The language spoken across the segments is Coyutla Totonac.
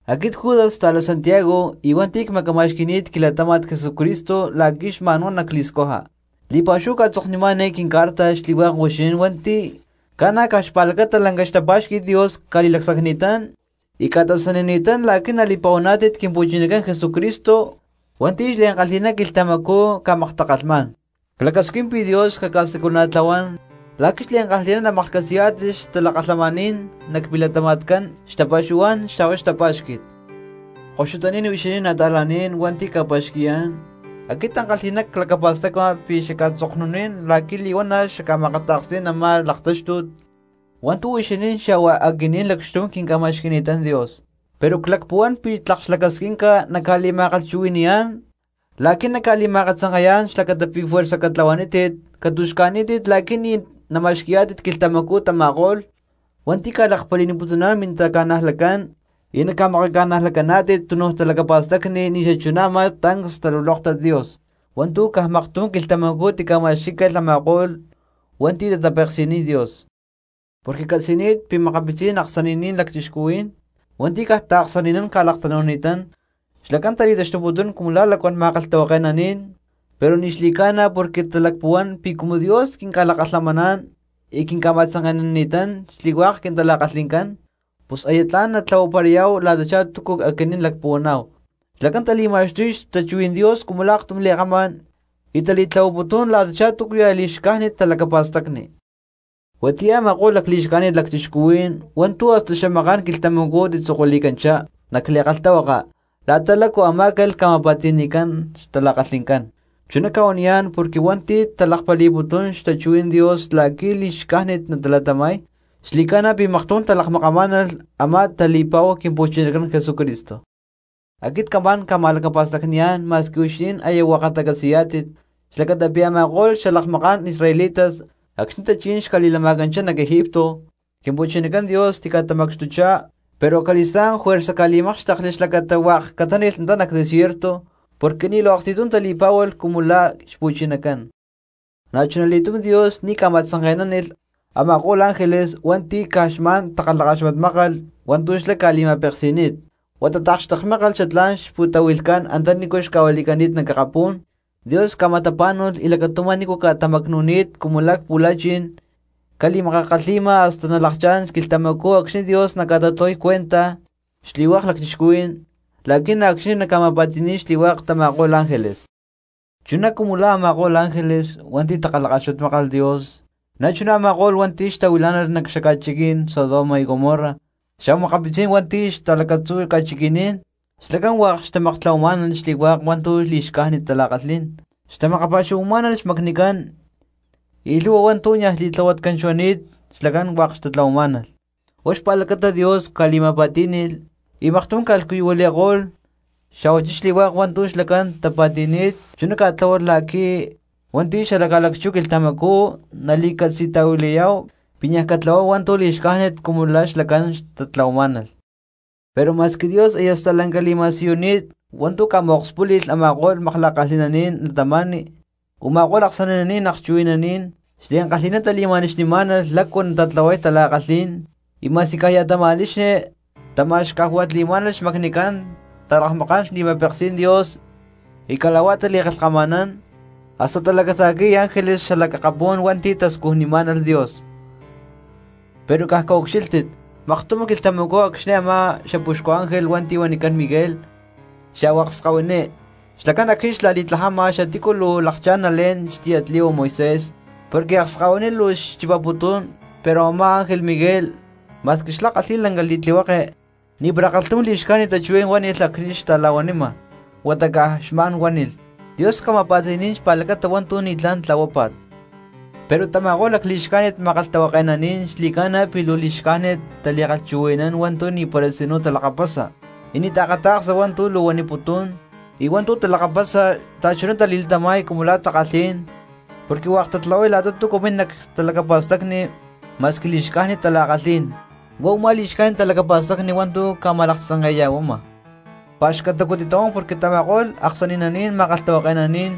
Aquit Judas xta̠lá Santiago y hua̠nti̠ cmacama̠xqui̠ni̠t quilatáma̠t Jesucristo la̠qui̠ xma̠nhuá nacli̠scuja. Li̠pa̠xúhu cca̠tzoknimá̠n eé quincarta xli̠hua̠k huixinín hua̠nti̠ Ca̠na caj xpa̠lacata lanca xtapá̠xqui̠t Dios ca̠li̠lacsacni̠tán y ca̠tasanini̠tán la̠qui̠ nali̠pa̠huaná̠tit Quimpu̠chinacán Jesucristo hua̠nti̠ xliankalhi̠ná quilhtamacú ca̠maktakalhmá̠n. Clacasquín pi̠ Dios caca̠siculana̠tlahuán la̠qui̠ xliankalhi̠ná namaklhcatzi̠yá̠tit xtalakalhamaní̠n nac milatama̠tcán, xtapa̠xuhuá̠n xa̠huá xtapá̠xqui̠t. Koxutaní̠n huixinín nata̠laní̠n hua̠nti̠cca̠pa̠xqui̠yá̠n, aquit ankalhi̠ná clacapa̠stacma pi̠ xacca̠tzoknunín la̠qui̠ li̠huana̠ xacca̠ma̠kata̠ksní̠n a̠má laktáxtut hua̠ntu̠ huixinín xa̠hua aquinín lacxtum quinca̠ma̠xqui̠ni̠tán Dios; pero clacpuhuán pi̠ tlak xlacasquinca nacca̠li̠ma̠kalhchuhui̠ni̠yá̠n la̠qui̠ nacca̠li̠ma̠akatzanke̠yá̠n xlacata pi̠ juerza catlahuanítit catu̠xca̠ní̠tit la̠qui̠ ni̠ nama̠xqui̠yá̠tit quilhtamacú tama̠ko̠lh hua̠nti̠ ca̠lakpali̠niputuná̠n mintaca̠najlatcán y naca̠makaca̠najlacaná̠tit tunuj talacapa̠stacni ni̠ xachuná a̠má tancs xtalulóktat Dios hua̠ntu̠ caj maktum quilhtamacú tica̠ma̠xquí̠calh a̠ma̠ko̠lh cristianos hua̠nti̠ tatapeksi̠niy Dios. Porque ccatzi̠ni̠t pi̠ makapitzí̠n aksani̠naní̠n lacchixcuhuí̠n hua̠nti̠ caj taaksani̠nán ca̠laktanu̠ni̠tán, xlacán tali̠taxtuputún cumu la̠ lacuán ma̠kalhtahuake̠naní̠n pero ni̠ xli̠ca̠na porque talacpuhuán pi̠ cumu Dios quinca̠lakalhamaná̠n y quinca̠ma̠tzanke̠nanini̠tán xli̠hua̠k quintala̠kalhi̠ncán, pus aya tla̠n natlahuaparayá̠hu la̠tachá túcu aquinín lacpuhuaná̠hu. Xlacán tali̠ma̠xtuy xtachuhuí̠n Dios cumu la̠ aktum li̠kama̠n y tali̠tlahuaputún la̠tachá túcuya̠ li̠xcájnit talacapa̠stacni. Huatiyá u̠ma̠ko̠lh lacli̠xcájnit lacchixcuhuí̠n hua̠ntu̠ hasta xamaká̠n quilhtamacú tzokuili̠cani̠tanchá nac li̠kalhtahuaka la̠ta lácu amá̠calh ca̠ma̠pa̠ti̠ni̠cán xtala̠kalhi̠ncán. Chuná cca̠huaniyá̠n porque hua̠nti̠ talakpali̠putún xtachuhuí̠n Dios la̠qui̠ li̠xcájnit natalatama̠y, xli̠ca̠na pi̠ maktum talakmakamá̠nalh a̠má tali̠pa̠hu Quimpu̠chinacán Jesucristo. Aquit camá̠n ca̠ma̠lacapa̠stacni̠yá̠n ma̠squi huixinín aya hua̠katá catzi̠yá̠tit, xlacata pi̠ a̠ma̠ko̠lh xalakmaká̠n israelitas acxni̠ tachí̠n xca̠li̠lama̠canchá nac Egipto, Quimpu̠chinacán Dios tica̠tamacxtuchá; pero acali̠stá̠n juerza ca̠li̠mákxtekli xlacata hua̠k catáni̠lh antá nac desierto porque ni̠ luu aksti̠tum tali̠pá̠hualh cumu la̠ xpu̠chinacán. Na̠chuna li̠túm Dios ni̠ ca̠ma̠tzanke̠nánilh a̠ma̠ko̠lh ángeles hua̠nti̠ caj xma̠n takalhakaxmatmákalh hua̠ntu̠ xlá xca̠li̠ma̠peksi̠ni̠t, huata taakxtekmákalh xatlá̠n xpu̠tahui̠lhcán antanícu xca̠huili̠cani̠t nac akapú̠n; Dios ca̠ma̠tapá̠nu̠lh y lacatumá nícu ca̠tamacnu̠ni̠t cumu la̠ cpu̠la̠chi̠n ca̠li̠makakalhi̠ma hasta nalakchá̠n quilhtamacú acxni̠ Dios naca̠ta̠tlahuay cuenta xli̠hua̠k cristianos la̠qui̠ na̠ acxni̠ naca̠ma̠pa̠ti̠ni̠y xli̠hua̠k tama̠ko̠lh ángeles. Chuná cumu la̠ a̠ma̠ko̠lh ángeles hua̠nti̠ takalhakaxmatmákalh Dios na̠chuná a̠ma̠ko̠lh cristianos hua̠nti̠ xtahuilá̠nalh nac xaca̠chiquí̠n Sodoma y Gomorra xa̠hua makapitzí̠n hua̠nti̠ xta̠lacatzú ca̠chiqui̠ní̠n, xlacán hua̠k xtamaktlahuamá̠nalh xli̠hua̠k hua̠ntu̠ li̠xcájnit tala̠kalhí̠n, xtamakpa̠xuhuamá̠nalh xmacnicán, y lhu̠hua hua̠ntu̠ niaj xli̠tlahuatcán xuani̠t xlacán hua̠k xtatlahuamá̠nalh. Huá xpa̠lacata Dios ca̠li̠ma̠pa̠tí̠ni̠lh y maktum ca̠lhcuyuhuili̠ko̠lh, xa̠huachí xli̠hua̠k hua̠ntu̠ xlacán tapa̠ti̠ni̠t chuná ca̠tláhualh la̠qui̠ cristianos xala ca̠lacchú quilhtamacú nali̠catzi̠tahuilayá̠hu pi̠ niaj catlahuáhu hua̠ntu̠ li̠xcájnit cumu la̠ xlacán xtatlahuamá̠nalh. Pero ma̠squi Dios aya stalanca li̠ma̠siyuni̠t hua̠ntu̠ ca̠ma̠akspúli̠lh a̠ma̠ko̠lh makla̠kalhi̠naní̠n cristianos, u̠ma̠ko̠lh aksani̠naní̠n akchuhui̠naní̠n xliankalhi̠ná tali̠ma̠nixnimá̠nalh lácu natatlahuay tala̠kalhí̠n, y ma̠squi caj ya̠ tama̠nixni tama̠xcajua̠li̠má̠nalh xmacnicán, talakmakán xli̠ma̠peksí̠n Dios y cala̠huá tali̠kalhkama̠nán, hasta talacata̠qui̠y ángeles xalac akapú̠n hua̠nti̠ tascujnimá̠nalh Dios. Pero caj caucxílhtit, maktum quilhtamacú acxni̠ a̠má xapuxcu ángel hua̠nti̠ huanicán Miguel, xa̠huá akskahuiní xlacán acxni̠ xla̠li̠tlajama xatícu luu lakchá̠n nalé̠n xtiyatli̠hua Moisés, porque akskahuiní luu xchipaputún, pero a̠má ángel Miguel, ma̠squi xlá kalhi̠y lanca li̠tlihueke, ni̠para kalhtum li̠xcájnit tachuhuí̠n huánilh acxni̠ xta̠la̠huanima, huata caj xma̠n huánilh: “¡Dios cama̠pa̠ti̠ní̠n xpa̠lacata hua̠ntu̠ ni̠tlá̠n tlahuápa̠t!” Pero tama̠ko̠lh lacli̠xcájnit ma̠kalhtahuake̠naní̠n xli̠ca̠na pi̠ luu li̠xcájnit tali̠kalhchuhui̠nán hua̠ntu̠ ni̠para tzinú talakapasa y ni̠ taakata̠ksa hua̠ntu̠ luu huaniputún; y hua̠ntu̠ talakapasa xta̠chuná tali̠latama̠y cumu la̠ takalhí̠n porque hua̠k tatlahuay la̠ta túcu min nac xtalacapa̠stacni ma̠squi li̠xcájnit tala̠kalhí̠n. Huá u̠má li̠xcájnit talacapa̠stacni hua̠ntu̠ ca̠ma̠laktzanke̠ya̠huama. ¡Pa̠xcatacu titahuán, porque xli̠hua̠k tama̠ko̠lh aksani̠naní̠n ma̠kalhtahuake̠naní̠n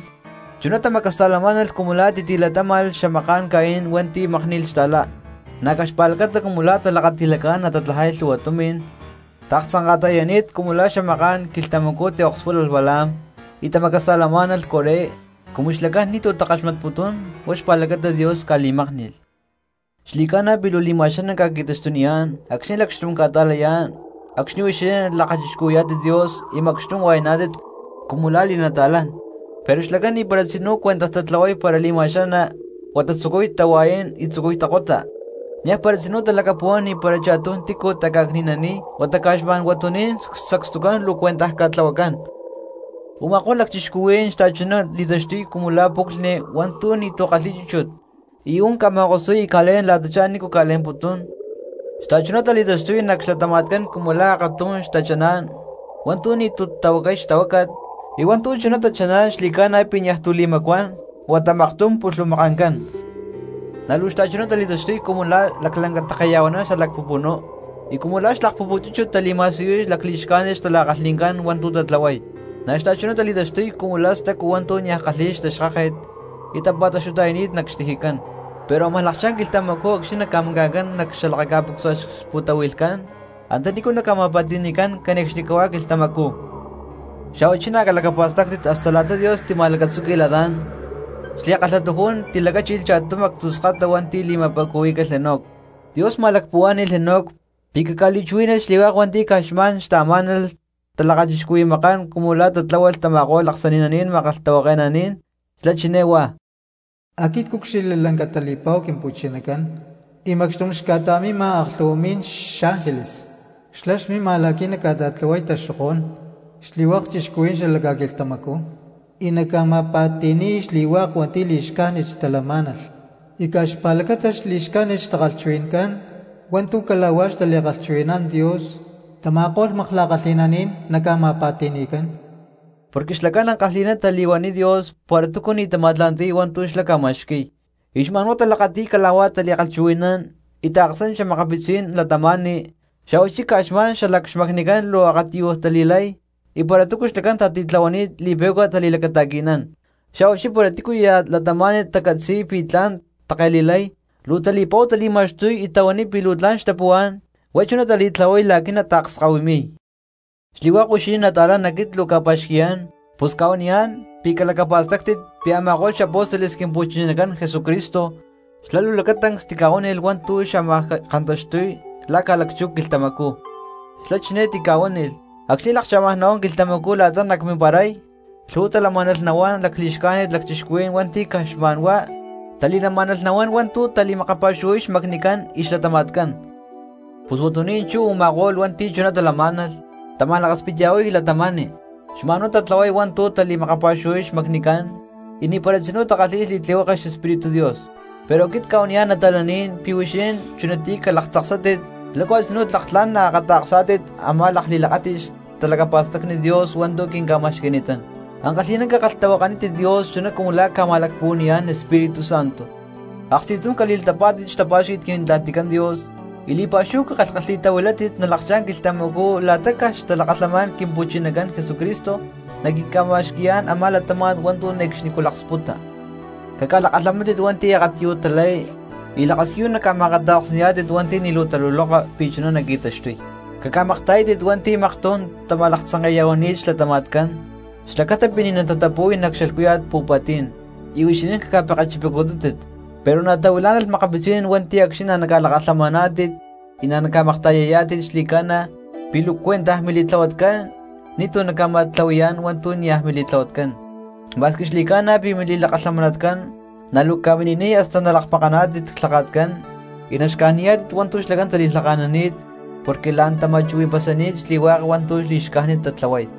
chuná tamacasta̠lamá̠nalh cumu la̠ titi̠latáma̠lh xamaká̠n Caín hua̠nti̠ mákni̠lh xta̠lá! Na̠ caj xpa̠lacata cumu talakati̠lacá̠n natatlajay lhu̠hua tumi̠n taaktzanka̠ta̠yani̠t cumu la̠ xamaká̠n quilhtamacú tiakspúlalh Balaam, y tamacasta̠lamá̠nalh Coré cumu xlacán ni̠tu̠ takaxmatputún huá xpa̠lacata Dios ca̠li̠mákni̠lh. Xli̠ca̠na pi̠ luu li̠ma̠xaná ca̠qui̠taxtuniyá̠n acxni̠ lacxtum ca̠ta̠layá̠n acxni̠ huixinín lakachixcuhui̠yá̠tit Dios y macxtum hua̠yaná̠tit cumu la̠ li̠nata̠lán, pero xlacán ni̠para tzinú cuentaj tatlahuay para li̠ma̠xaná huata tzucuy tahua̠yán y tzucuy takota, niaj para tzinú talacapuhuán ni̠para cha̠tum tícu taca̠cni̠naniy, huata caj xma̠n huatuní̠n sacstucán luu cuentaj ca̠tlahuacán. Uma̠kó̠lh lacchixcuhuí̠n xta̠chuná tali̠taxtuy cumu la̠ puclhni hua̠ntu̠ ni̠tu̠ kalhi̠y chúchut y ú̠n ca̠ma̠kosuy y ca̠lé̠n la̠tachá nícu naca̠le̠mputún. Xta̠chuná tali̠taxtuy nac xlatama̠tcán cumu la̠ akatum tachaná̠n hua̠ntu̠ ni̠tu̠ tahuacay xtahuácat, y hua̠ntu̠ chuná tachaná̠n xli̠ca̠na pi̠ niaj tu̠ li̠macuán huata maktum pulhumakancán. Na̠ luu xta̠chuná tali̠taxtuy cumu la̠ laclanca ta̠keya̠huaná xalac pupunú y cumu la̠ xlakpúput chúchut tali̠ma̠siyuy lacli̠xcájnit xtala̠kalhi̠ncán hua̠ntu̠ tatlahuay. Na̠ xta̠chuná tali̠taxtuy cumu la̠ stacu hua̠ntu̠ niaj kalhi̠y xtaxkáket y tapa̠taxtuta̠yani̠t nac xtijicán, pero ámaj lakchá̠n quilhtamacú acxni̠ naca̠maca̠ncán nac xalakaca̠pucsua xpu̠tahui̠lhcán antanícu naca̠ma̠pa̠ti̠ni̠cán cane̠cxnicahuá quilhtamacú. Xa̠huachí na̠ calacapa̠stáctit hasta la̠ta Dios tima̠lacatzúqui̠lh Adán, xli̠kalhatujún tilacáchilh cha̠tum actzú skata hua̠nti̠ li̠ma̠pa̠cuhuí̠calh Enoc, Dios ma̠lacpuhuá̠ni̠lh Enoc pi̠ caca̠li̠chuhuí̠nalh xli̠hua̠k hua̠nti̠ caj xma̠n xtaamá̠nalh talakachixcuhui̠makán cumu la̠ tatlahuay tama̠ko̠lh aksani̠naní̠n ma̠kalhtahuake̠naní̠n, xlá chiné huá: “Aquit cúcxilhli lanca tali̠pa̠hu Quimpu̠chinacán y macxtum xca̠ta̠mima aklhu̠hua mi̠lh xángeles. Xlá xmima la̠qui̠ naca̠ta̠tlahuay taxokó̠n xli̠hua̠k cristianos xala ca̠quilhtamacú y naca̠ma̠pa̠ti̠ni̠y xli̠hua̠k hua̠nti̠ li̠xcájnit xtalamá̠nalh, y caj xpa̠lacata li̠xca̠jnit xtakalhchuhui̠ncán hua̠ntu̠ cala̠huá xtali̠kalhchuhui̠nán Dios, tama̠ko̠lh makla̠kalhi̠nanín naca̠ma̠pa̠ti̠ni̠cán.” Porque xlacán ankalhi̠ná tali̠huaniy Dios para túcu ni̠ tama̠tla̠nti̠y hua̠ntu̠ xlá ca̠ma̠xqui̠y, y xma̠n huá talakati̠y cala̠huá tali̠kalhchuhui̠nán y taaksán xa̠makapitzí̠n cristianos, xa̠huachí caj xma̠n xalac xmacnicán luu akatiyuj tali̠lay, y para túcu xlacán tatitlahuani̠t li̠pe̠cua tali̠lacata̠qui̠nán, xa̠huachí para tícuya̠ cristiano tacatzi̠y pi̠ tla̠n natake̠li̠lay luu tali̠pa̠hu tali̠ma̠xtuy y tahuaniy pi̠ luu tla̠n xtapuhuá̠n, huá chuná tali̠tlahuay la̠qui̠ nataakskahuimi̠y. Xli̠hua̠k huixinín nata̠lán aquit luu cca̠pa̠xqui̠yá̠n, pus cca̠huaniyá̠n pi̠ calacapa̠stáctit pi̠ a̠ma̠ko̠lh xapóstoles Quimpu̠chinacán Jesucristo xlá luu lacatancs tica̠huánilh hua̠ntu̠ xámaj kantaxtuy la̠ ca̠lacchú quilhtamacú. Xlá chiné tica̠huánilh: “Acxni̠ lakchá̠maj nahuán quilhtamacú la̠ta nacmimparay, lhu̠hua talamá̠nalh nahuán lacli̠xcájnit cristianos hua̠nti̠ caj xma̠n huá tali̠lamá̠nalh nahuán hua̠ntu̠ tali̠makapa̠xuhuay xmacnicán y xlatama̠tcán.” Pus huatuní̠n chú u̠ma̠ko̠lh cristianos hua̠nti̠ chuná talamá̠nalh tama̠lakaspitya̠huay cristianos, xma̠n huá tatlahuay hua̠ntu̠ tali̠makapa̠xuhuay xmacnicán, y ni̠para tzinú takalhi̠y xli̠tlihueke xEspíritu Dios. Pero aquit cca̠huaniyá̠n nata̠laní̠n pi̠ huixinín chunatiyá calaktzaksátit lácu a̠tzinú tlak tla̠n naakata̠ksá̠tit a̠má lakli̠lakáti̠t xtalacapa̠stacni Dios hua̠ntu̠ quinca̠ma̠xqui̠ni̠tán. Ankalhi̠ná cakalhtahuakanítit Dios chuná cumu la̠ ca̠ma̠lacpuhua̠ni̠yá̠n Espíritu Santo. Aksti̠tum cali̠latapá̠tit xtapá̠xqui̠t Quintla̠ticán Dios, y li̠pa̠xúhu cakalhkalhi̠tahuilátit nalakchá̠n quilhtamacú la̠ta caj xtalakalhamaní̠n Quimpu̠chinacán Jesucristo naquinca̠ma̠xqui̠yá̠n a̠má latáma̠t hua̠ntu̠ ne̠cxnicú laksputa. Caca̠lakalhamántit hua̠nti̠ akatiyuj talay y lakasiyu naca̠ma̠akata̠ksni̠yá̠tit hua̠nti̠ ni̠ luu tataluloka pi̠ chuná qui̠taxtuy. Caca̠makta̠yátit cristianos hua̠nti̠ maktum tama̠laktzanke̠ya̠huani̠t xlatama̠tcán, xlacata pi̠ ni̠ natatapú̠y nac xalhcúya̠t pu̠pa̠ti̠n, y huixinín caca̠pekechipacutútit. Pero na̠ tahuilá̠nalh xa̠makapitzí̠n hua̠nti̠ acxni̠ naca̠lakalhamaná̠tit y naca̠makta̠yayá̠tit xli̠ca̠na pi̠ luu cuentaj mili̠tlahuatcán, ni̠tu̠ naca̠ma̠tlahui̠yá̠n hua̠ntu̠ niaj mili̠tlahuatcán, ma̠squi xli̠ca̠na pi̠ mili̠lakalhamanatcán, na̠ luu ca̠mini̠niy hasta nalakmakaná̠tit clhaka̠tcán y naxcajniyá̠tit hua̠ntu̠ xlacán tali̠lhaka̠nani̠t porque la̠n tama̠chuhui̠pasani̠t xli̠hua̠k hua̠ntu̠ li̠xcájnit tatlahuay.